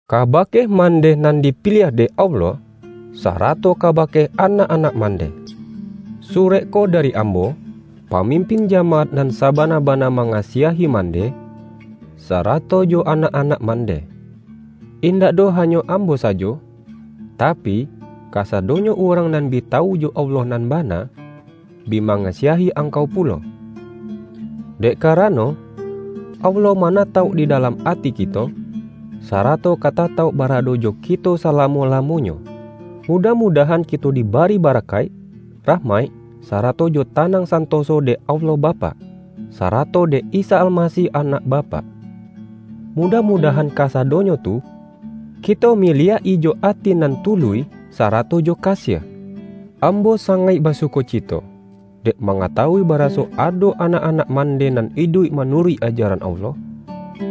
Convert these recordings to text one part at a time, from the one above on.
Kabake mandeh nan dipiliah dek Allah, sarato kabake anak-anak mandeh. Surek ko dari ambo, pa-mimpin jamaat nan sabana-bana ma-ngasiahi mandeh, sarato jo anak-anak mandeh. Indak doh hanyo ambo sa-jo, tapi, kasadonyo urang nan bi ta-wu jo Allah nan bana, bi mangasiahi angkau pulo. Dek karano, Allah ma-natauk di dalam ati kito, sarato ka ta-tauk barado jo kito salamo-lamonyo. Mudah-mudahan kito dibari bara-kaik, rahmaik, sarato jo tanang santoso dek Allah Bapak, sarato dek Isa Almasih Anak Bapak. Mudah-mudahan kasa-donyo tu, kito miliak-i jo ati nan tu-luih sarato jo kasiah. Ambo sangaik basukocito, dek ma-ngatawui baraso ado anak-anak man-deh nan iduik manuruik ajaran Allah,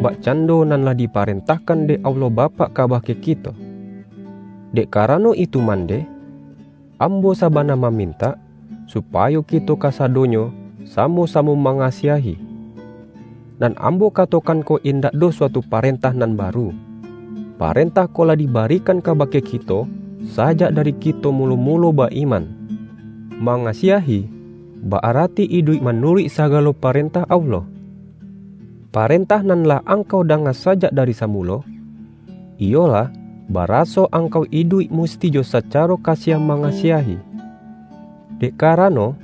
bakcando nan lah diparentahkan dek Allah Bapak kabake kito. Dek karano itu mandeh, ambo sabana mamintak, supayo kito kasadonyo samo-samo mangasiahi. Nan ambo katokan ko in-dak doh suatu parentah nan baru; pa-rentah ko lah dibarikan kabake kito, sajak dari kito mulo-mulo ba-iman. Mangasiahi, ba-arati iduik manuruik sagalo parentah Allah. Parentah nan lah angkau danga sajak dari samulo, iyolah, baraso angkau iduik musti jo sacaro kasiah mangasiahi. Dek karano,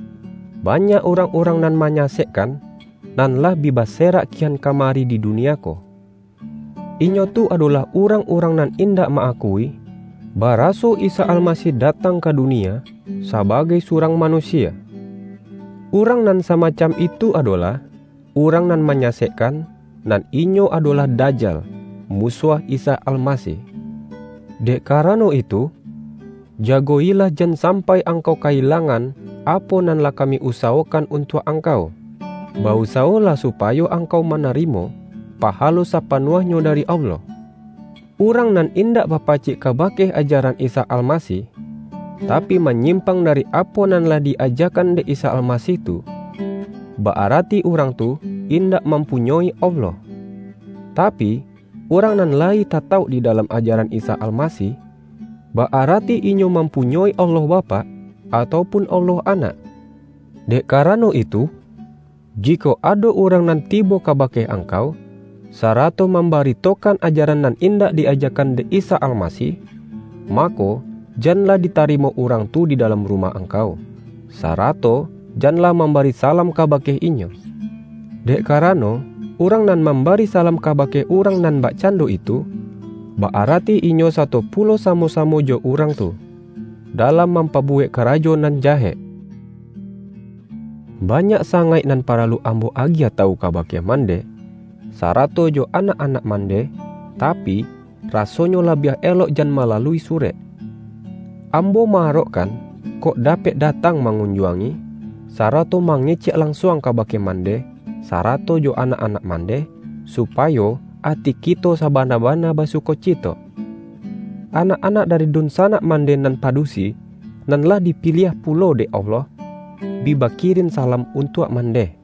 banyak urang-urang nan manyasekkan, nan lah bi baserak kian kamari di dunia ko. Inyo tu adolah urang-urang nan indak ma-akui, bara-so Isa Almasih datang ka dunia sabagai surang manusia. Urang nan samacam itu adolah urang nan manyasekkan, nan inyo adolah Dajal, musuah Isa Almasih. Dek karano itu, jago-ilah jan sampai angkau ka-ilangan apo nan lah kami usawokan untuak angkau. Ba-usawolah supayo angkau manarimo pahalo sapanuahnyo dari Allah. Urang nan indak bapacik kabake ajaran Isa Almasih, tapi manyim-pang dari apo nan lah di-ajakan dek Isa Almasih tu, ba-arati urang tu indak mampunyoi Allah. Tapi, urang nan la-yi tatauk di dalam ajaran Isa Almasih, ba-arati inyo mampunyoi Allah Bapak atau pun Allah Anak. Dek karano itu, jikok ado urang nan tibo kabake ang-kau, sarato mambaritokan ajaran nan indak di-ajakan dek Isa Almasih, ma-ko, janlah ditarimo urang tu di dalam rumah angkau, sarato jan lah mam-bari salam kabake inyo. Dek kara-no, urang nan mambari salam kabake urang nan bakcando itu, ba-arati inyo sato pulo samo-samo jo urang tu, da-lam mampabuwek karajo nan jahek. Banyak sangaik nan paralu ambo agiah tawu kabake mandeh, sarato jo anak-anak mandeh, tapi, rasonyo labiah elok jan malalui surek. Ambo ma-arok-kan kok dapek datang mangunjuangi, sarato mangecek lansuang kabake man-deh, sarato jo anak-anak mandeh, supa-yo ati kito sabana-bana basukocito. Anak-anak dari dunsanak man-deh nan padusi, nan lah dipiliah pu-lo dek Allah, bi bakirin salam untuak mandeh.